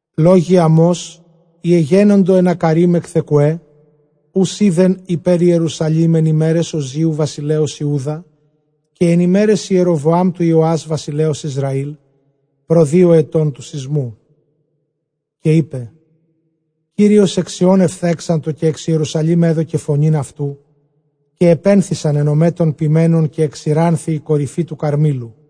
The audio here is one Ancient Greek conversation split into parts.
ΛΟΓΟΙ Αμὼς οἳ ἐγένοντο ἐν Ἀκκαρεὶμ ἐν Θεκουὲ, οὓς εἶδεν ὑπὲρ Ἱερουσαλὴμ, ἐν ἡμέραις Ὀζίου βασιλέως Ἰούδα, καὶ ἐν ἡμέραις Ἱεροβοὰμ τοῦ Ἰωὰς βασιλέως Ἰσραὴλ, πρὸ δύο ἐτῶν τοῦ σεισμοῦ. Καὶ εἶπε, Κύριος ἐκ Σιὼν ἐφθέγξατο, καὶ ἐξ Ἱερουσαλὴμ ἔδωκε φωνὴν αὐτοῦ· καὶ ἐπένθησαν αἱ νομαὶ τῶν ποιμένων, καὶ ἐξηράνθη ἡ κορυφὴ τοῦ Καρμήλου.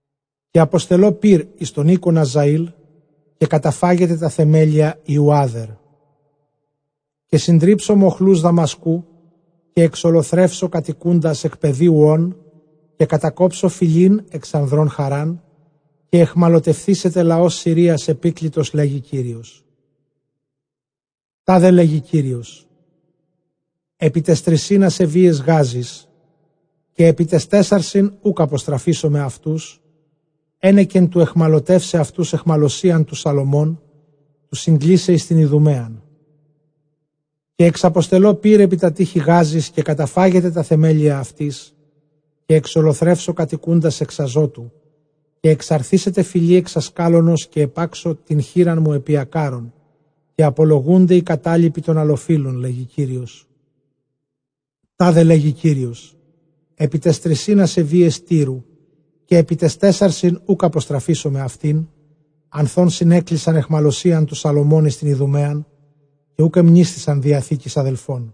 Καὶ ἀποστελῶ πῦρ εἰς τὸν οἶκον Ἀζαὴλ, καὶ καταφάγεται τὰ θεμέλια υἱοῦ Ἄδερ. Καὶ συντρίψω μοχλοὺς Δαμασκοῦ, καὶ ἐξολοθρεύσω κατοικοῦντας ἐκ πεδίου Ὦν, καὶ κατακόψω φυλὴν ἐξ ἀνδρῶν Χαῤῥὰν, καὶ αἰχμαλωτευθήσεται λαὸς Συρίας ἐπίκλητος, λέγει Κύριος. Τάδε λέγει Κύριος, ἐπὶ ταῖς τρισὶν ἀσεβείαις Γάζης, καὶ ἐπὶ ταῖς τέσσαρσιν οὐκ ἀποστραφήσομαι αὐτοὺς, ἕνεκεν τοῦ αἰχμαλωτεῦσαι αὐτοὺς αἰχμαλωσίαν τοῦ Σαλωμὼν, τοῦ συγκλεῖσαι εἰς τὴν Ἰδουμαίαν. Καὶ ἐξαποστελῶ πῦρ ἐπὶ τὰ τείχη Γάζης, καὶ καταφάγεται τὰ θεμέλια αὐτῆς. Καὶ ἐξολοθρεύσω κατοικοῦντας ἐξ Ἀζώτου, καὶ ἐξαρθήσεται φυλὴ ἐξ Ἀσκάλωνος, καὶ ἐπάξω τὴν χεῖρά μου ἐπὶ Ἀκκάρων, καὶ ἀπολοῦνται οἱ κατάλοιποι τῶν ἀλλοφύλων, λέγει Κύριος. Τάδε λέγει Κύριος, ἐπὶ ταῖς τρισὶν ἀσεβείαις Τύρου, καὶ ἐπὶ ταῖς τέσσαρσιν οὐκ ἀποστραφήσομαι αὐτὴν, ἀνθʼ ὧν συνέκλεισαν αἰχμαλωσίαν τοῦ Σαλωμὼν εἰς τὴν Ἰδουμαίαν, καὶ οὐκ ἐμνήσθησαν διαθήκης ἀδελφῶν.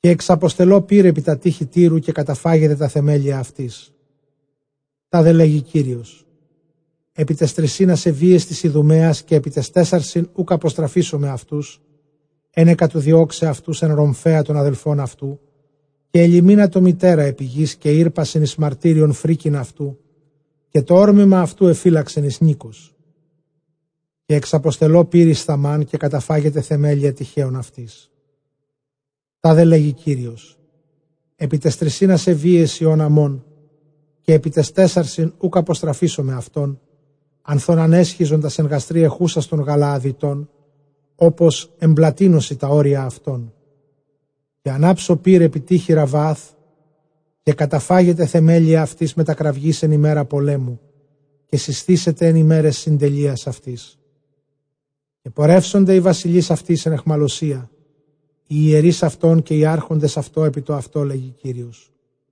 Καὶ ἐξαποστελῶ πῦρ ἐπὶ τὰ τείχη Τύρου, καὶ καταφάγεται τὰ θεμέλια αὐτῆς. Τάδε λέγει Κύριος, ἐπὶ ταῖς τρισὶν ἀσεβείαις τῆς Ἰδουμαίας, καὶ ἐπὶ ταῖς τέσσαρσιν οὐκ ἀποστραφήσομαι αὐτοὺς, ἕνεκα τοῦ διῶξαι αὐτοὺς ἐν ῥομφαίᾳ τὸν ἀδελφὸν αὐτοῦ, καὶ ἐλυμήνατο μητέρα ἐπὶ γῆς, καὶ ἥρπασεν εἰς μαρτύριον φρίκην αὐτοῦ, καὶ τὸ ὅρμημα αὐτοῦ ἐφύλαξεν εἰς νῖκος. Καὶ ἐξαποστελῶ πῦρ εἰς Θαμὰν, καὶ καταφάγεται θεμέλια τειχέων αὐτῆς. Τάδε λέγει Κύριος, ἐπὶ ταῖς τρισὶν ἀσεβείαις υἱῶν Ἀμμὼν, καὶ ἐπὶ ταῖς τέσσαρσιν οὐκ ἀποστραφήσομαι αὐτὸν, ἀνθʼ ὧν ἀνέσχιζον τὰς ἐν γαστρὶ ἐχούσας τῶν Γαλααδιτῶν, ὅπως ἐνπλατύνωσι τὰ ὅρια ἑαυτῶν. Καὶ ἀνάψω πῦρ ἐπὶ τεὶχη Ῥαββὰθ, καὶ καταφάγεται θεμέλια αὐτῆς μετὰ κραυγῆς ἐν ἡμέρᾳ πολέμου, καὶ σεισθήσεται ἐν ἡμέραις συντελείας αὐτῆς, καὶ πορεύσονται οἱ βασιλεῖς αὐτῆς ἐν αἰχμαλωσίᾳ, οἱ ἱερεῖς αὐτῶν καὶ οἱ ἄρχοντες αὐτῶν ἐπιτοαυτὸ, λέγει Κύριος.